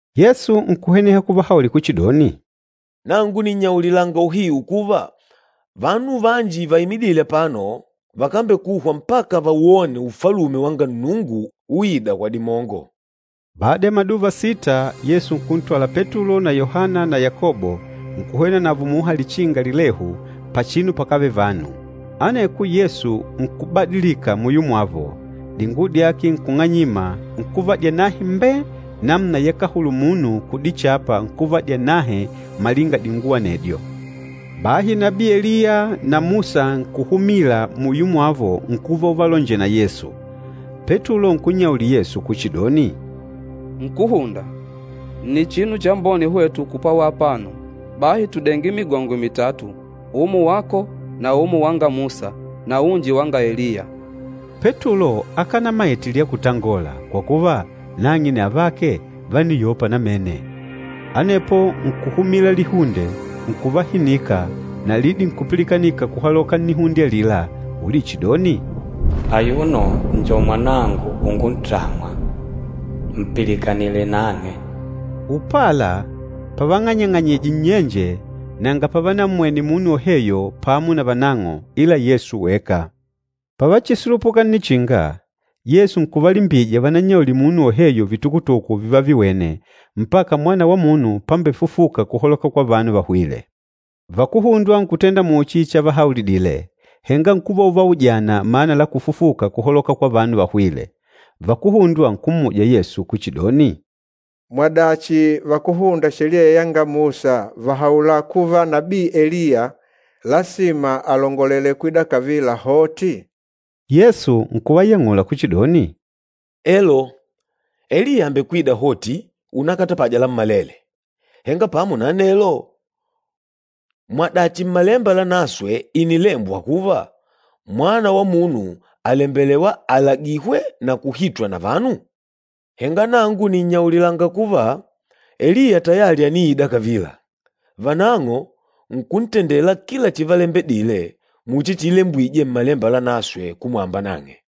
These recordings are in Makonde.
Yesu nkuhweneha kuvahaulila kuchidoni, “Nangu nìnnyaulilanga uhiu kuva, vanu vanji vaimidîle apano vakambekuhwa mpaka vawone Ufalume wanga Nnungu uìdà kwa dimongo.” Bada ya maduva sita, Yesu nkuntwala Petulo na Yohana na Yakobo nkuhwena navo muha lichinga lilehu pachinu pakávele vanu. Aneko Yesu nkubadilika muyo mwavo, dinguwo dyake nkung'anyima, nkuva dyanahe mbee namuna yakahulula munu kudichapa nkuva dyanahe malinga dinguwo anedyo. Bahi nabii Eliya na Musa nkuhumila muyo mwavo nkuva uvalonjela na Yesu. Petulo nkunnyaulila Yesu kuchidoni, “Nkúhunda, nni chinu chambone hwetu kupwawa apano, bahi tudenge migongwe mitatu, umo wako na umo wanga Musa na unji wanga Eliya.” Petulo akanamaite lya kutangola, kwa kuva, nang'e na avake vániyopa namene. Anepo nkuhumila lihunde nkuvahinika na lidi nkupilikanika kuhaloka nnihunde alila ulichidoni, “Ayuno njo Mwanangu unguntamwa, mpilikanile nang'e.” Upala, pavang'anyang'anyije nnyenje nanga pavanammwene munu woheyo pamo na vanang'o ila Yesu weka. Pavachisulupuka nnichinga, Yesu nkuvalimbija vanannyaulile munu woheyo vitukutuku vivaviwene, mpaka Mwana wa Munu pambefufuka kuhaloka kwa vanu vahwîle. Vakuhundwa nkutenda muchi chavahaulidile, henga nkuva uvaujana mana la kufufuka kuhaloka kwa vanu vahwîle. Vakuhundwa nkummuja Yesu kuchidoni, “Mwadachi vakúhunda Sheliya yanga Musa vàhaula kuva nabii Eliya lasima alongolele kwida kavila hoti?” Yesu nkuvayang'ula kuchidoni, “Elo, Eliya àmbekwida hoti unakatapaja lammalele. Henga pamo na anelo, mwadachi Mmalemba Lanaswe ìnilembwa kuva, Mwana wa Munu àlembelewa alagihwe na kuhitwa na vanu? Henga nangu nìnnyaulilanga kuva, Eliya tayali àniida kavila, vanang'o nkuntendela kila chivalembedile muchi chiilembwije Mmalemba Lanaswe kumwamba nang'e.”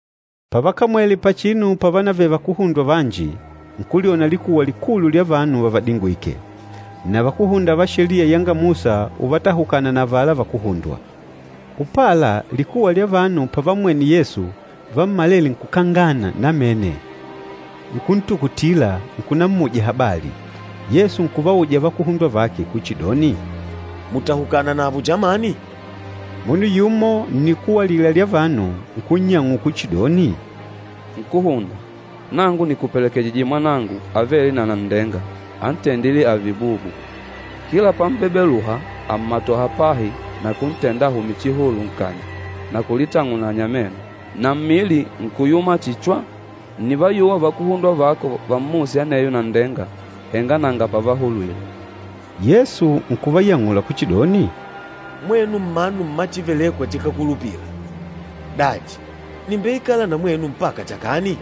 Pavakamwele pachinu pávanavele vakuhundwa vanji, nkulyona likuwa likulu lya vanu vavadingwìkè. Na vakúhunda va Sheliya yanga Musa uvatahukana na avala vakuhundwa. Upala likuwa lya vanu pavammwene Yesu, vammalele nkukangana namene, nkuntukutila, nkunammuja habali. Yesu nkuvauja vakuhundwa vake kuchidoni, “Mùtahukana navo chamani?” Munu yumo nnikuwa alila lya vanu nkunnyang'ula kuchidoni, “Nkúhunda, nangu nìkupelekejije mwanangu avêle na nanndenga antendîle ààve bubu. Kila pam'bebeluha àmmatoha pahi na kuntenda ahume chihulu nkanya na kulitang'unanya meno, na mmili nkuyuma chihi chwa. Ńnivayuwa vakuhundwa vako vammuse aneyo nanndenga, henga nanga pavahulwile.” Yesu nkuvayang'ula kuchidoni, “Mwenu mmanu mma chívelèkwà chikákulupila! Dachi, nìmbeikala na mwenu mpaka chakani?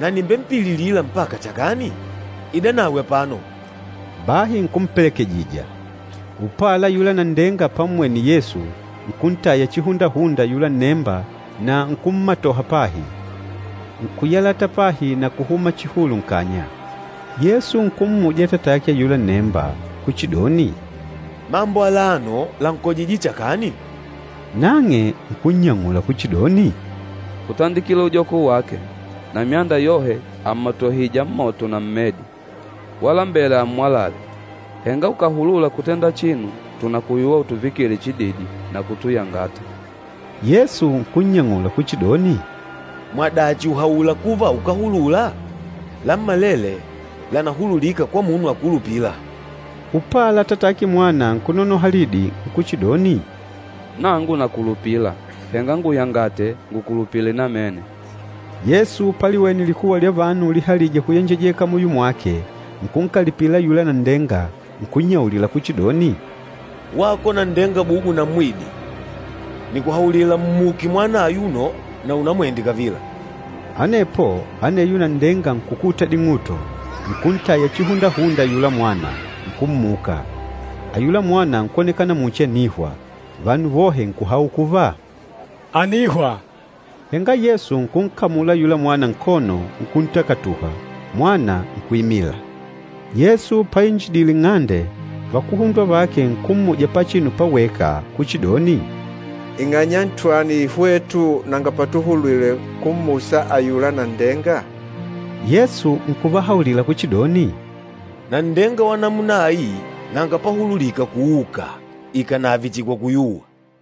Na nìmbempililila mpaka chakani? Idanawe apano.” Bahi nkumpelekejija. Upala ayula nanndenga pammwene Yesu, nkuntaya chihundahunda ayula nnemba na nkummatoha pahi, nkuyalata pahi na kuhuma chihulu nkanya. Yesu nkummuja atatake ayula nnemba nkuchidoni, “Mambo alano lànkojije chakani?” Nang'e nkunnyang'ula kuchidoni, “Kutandikila ujoko wake. Na myanda yohe àmmatohija mmoto na mmedi, walambela ammwalale. Henga ukàhulula kutenda chinu, tùnakuyuwa utuvikile chididi na kutuyangata!” Yesu nkunnyang'ula kuchidoni, “Mwadachi ùhaula kuva ukàhulula? Lammalele lànahululika kwa munu akulupîla.” Upala atatake mwana nkunonoha lidi nkuchidoni, “Nangu nakulupila! Henga nguyangate ngukulupile namene.” Yesu paliwene likuwa lya vanu ulihalija kuyenjejeka muyo mwake, nkunkalipila ayula nanndenga, nkunnyaulila kuchidoni, “Wako nanndenga bubu na mmwidi, nìkuhaulila, mmuke mwana ayuno na unamwende kavila!” Anepo aneyo nanndenga nkukuta ding'uto, nkuntaya chihundahunda ayula mwana, nkummuka. Ayula mwana nkwonekana muchi ànihwa, vanu vohe nkuhaula kuva, “Ànihwa!” Henga Yesu nkunkamula ayula mwana nkono nkuntakatuha, mwana nkuimila. Yesu painjidile nng'ande, vakuhundwa vake nkummuja pachinu paweka kuchidoni, “Ing'anya ntwani hwetu nanga patuhulwile kummusa ayula nanndenga?” Yesu nkuvahaulila kuchidoni, “Nanndenga wa namuna ai nanga pahululika kuuka, ikànave chihi kwa kuyuwa.”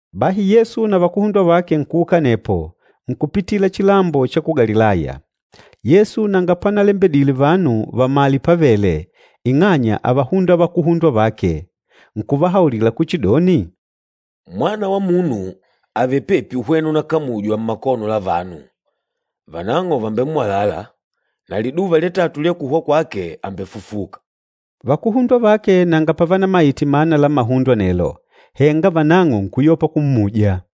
Bahi Yesu na vakuhundwa vake nkuuka anepo, nkupitila chilambo cha ku Galilaya. Yesu nanga panalembedile vanu vamale pávèlè, ing'anya ávahunda vakuhundwa vake. Nkuvahaulila kuchidoni, “Mwana wa Munu àvele pepi uhwena unakamujwa mmakono la vanu, vanang'o vàmbemmwalala, na liduva lya tatu lya kuhwa kwake àmbefufuka.” Vakuhundwa vake nanga pavanamaite mana la mahundo anelo. Henga vanang'o nkuyopa kummuja.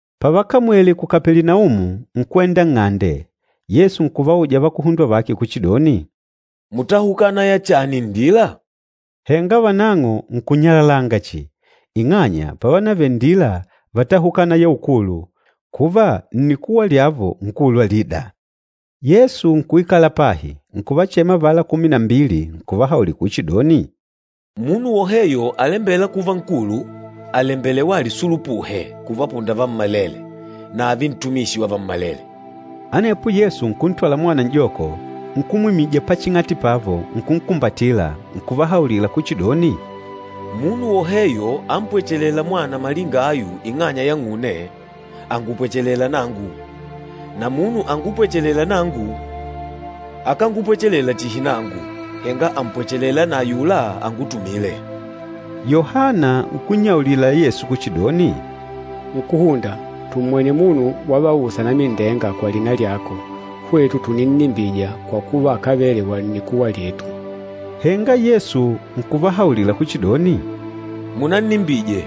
Pavakamwele Kapelinaumu, nkwenda nng'ande, Yesu nkuvauja vakuhundwa vake kuchidoni, “Mùtahukana ya chani nndila?” Henga vanang'o nkunyalalanga chihi, ing'anya pávanavele nndila vátahukana ya ukulu, kuva nnikuwa lyavo nkulu alida. Yesu nkuikala pahi, nkuvachema avala kumi na mbili, nkuvahaulila kuchidoni, “Munu woheyo alembêla kuva nkulu, àlembelewa alisulupuhe kuvapunda vammalele na ààve ntumishi wa vammalele.” Anepo Yesu nkùntwala mwana n'joko, nkumwimija paching'ati pavo nkunkumbatila, nkuvahaulila kuchidoni, “Munu woheyo ampwechelêla mwana malinga ayu ing'anya yang'une, àngupwechelela nangu. Na munu angupwechelêla nangu, akángupwechelela chihi nangu, henga àmpwechelela na ayula angutumîle.” Yohana nkunnyaulila Yesu kuchidoni, “Nkúhunda, tummwene munu wavausa anamindenga kwa lina lyako, hwetu tùninnimbija kwa kuva akávele wa nnikuwa lyetu.” Henga Yesu nkuvahaulila kuchidoni, “Munannimbije,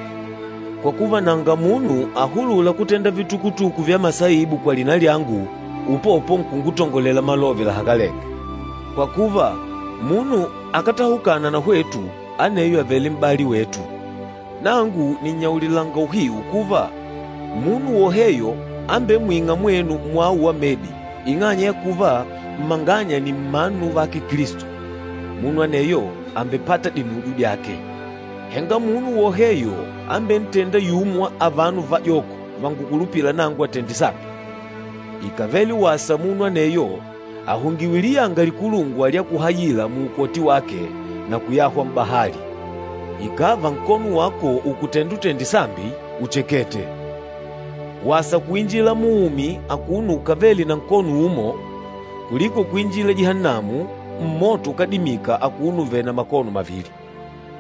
kwa kuva nanga munu ahulûla kutenda vitukutuku vya masaibu kwa lina lyangu, upopo nkungutongolela malove lahakalenge. Kwa kuva munu akátahukana na hwetu, aneyo àvele m'bali wetu. Nangu nìnnyaulilanga uhiu kuva, munu woheyo ambemwîng'a mwenu mwawo wa medi, ing'anya ya kuva mmanganya nni mmanu vake Kilisto, munu aneyo àmbepata dinujo dyake.” “Henga munu woheyo ambentênda yumo wa avano vajoko vangukulupîla nangu atende sambi, ikàvele wasa munu aneyo ahungiwe liyanga likulungwa lya kuhayila muukoti wake na kuyahwa m'bahali. Ikàva nkono wako ùkutenda utende sambi, uchekete! Wasa kuinjila muumi akuno ukavèlè na nkono umo, kuliko kuinjila Jihannamu, mmoto ukádimika akuno uvèlè na makono mavili. [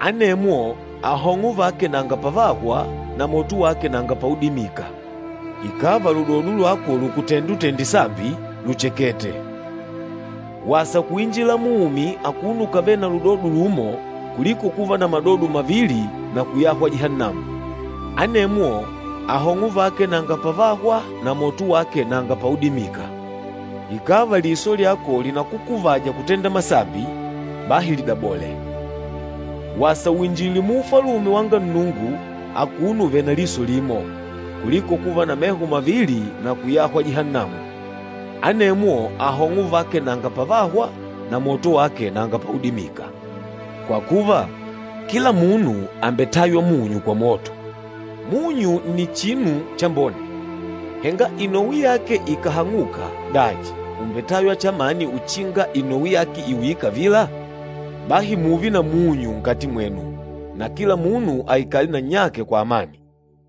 Anemwo ahong'o vake nanga pavahwa, na moto wake nanga paudimika.] Ikàva ludodo lwako lùkutenda utende sambi, luchakete! Wasa kuinjila muumi akuno ukavèlè na ludodo lumo, kuliko kuva na madodo mavili na kuyahwa Jihannamu. [ Anemwo ahong'o vake nanga pavahwa, na moto wake nanga paudimika.] Ikàva liso lyako lìnakukuvaja kutenda masambi, bahi lidabole! Wasa uinjile mu Ufalume wanga Nnungu akuno uvèlè na liso limo, kuliko kuva na meho mavili na kuyahwa Jihannamu. Anemwo ahong'o vake nanga pavahwa, na moto wake nanga paudimika. Kwa kuva, kila munu àmbetaywa munyu kwa moto. Munyu nni chinu chambone. Henga inowi yake ikàhang'uka, dachi, ùmbetaywa chamani uchinga inowi yake iuyile kavila? Bahi mùùve na munyu nkati mwenu na kila munu aikale na nnyake kwa amani.”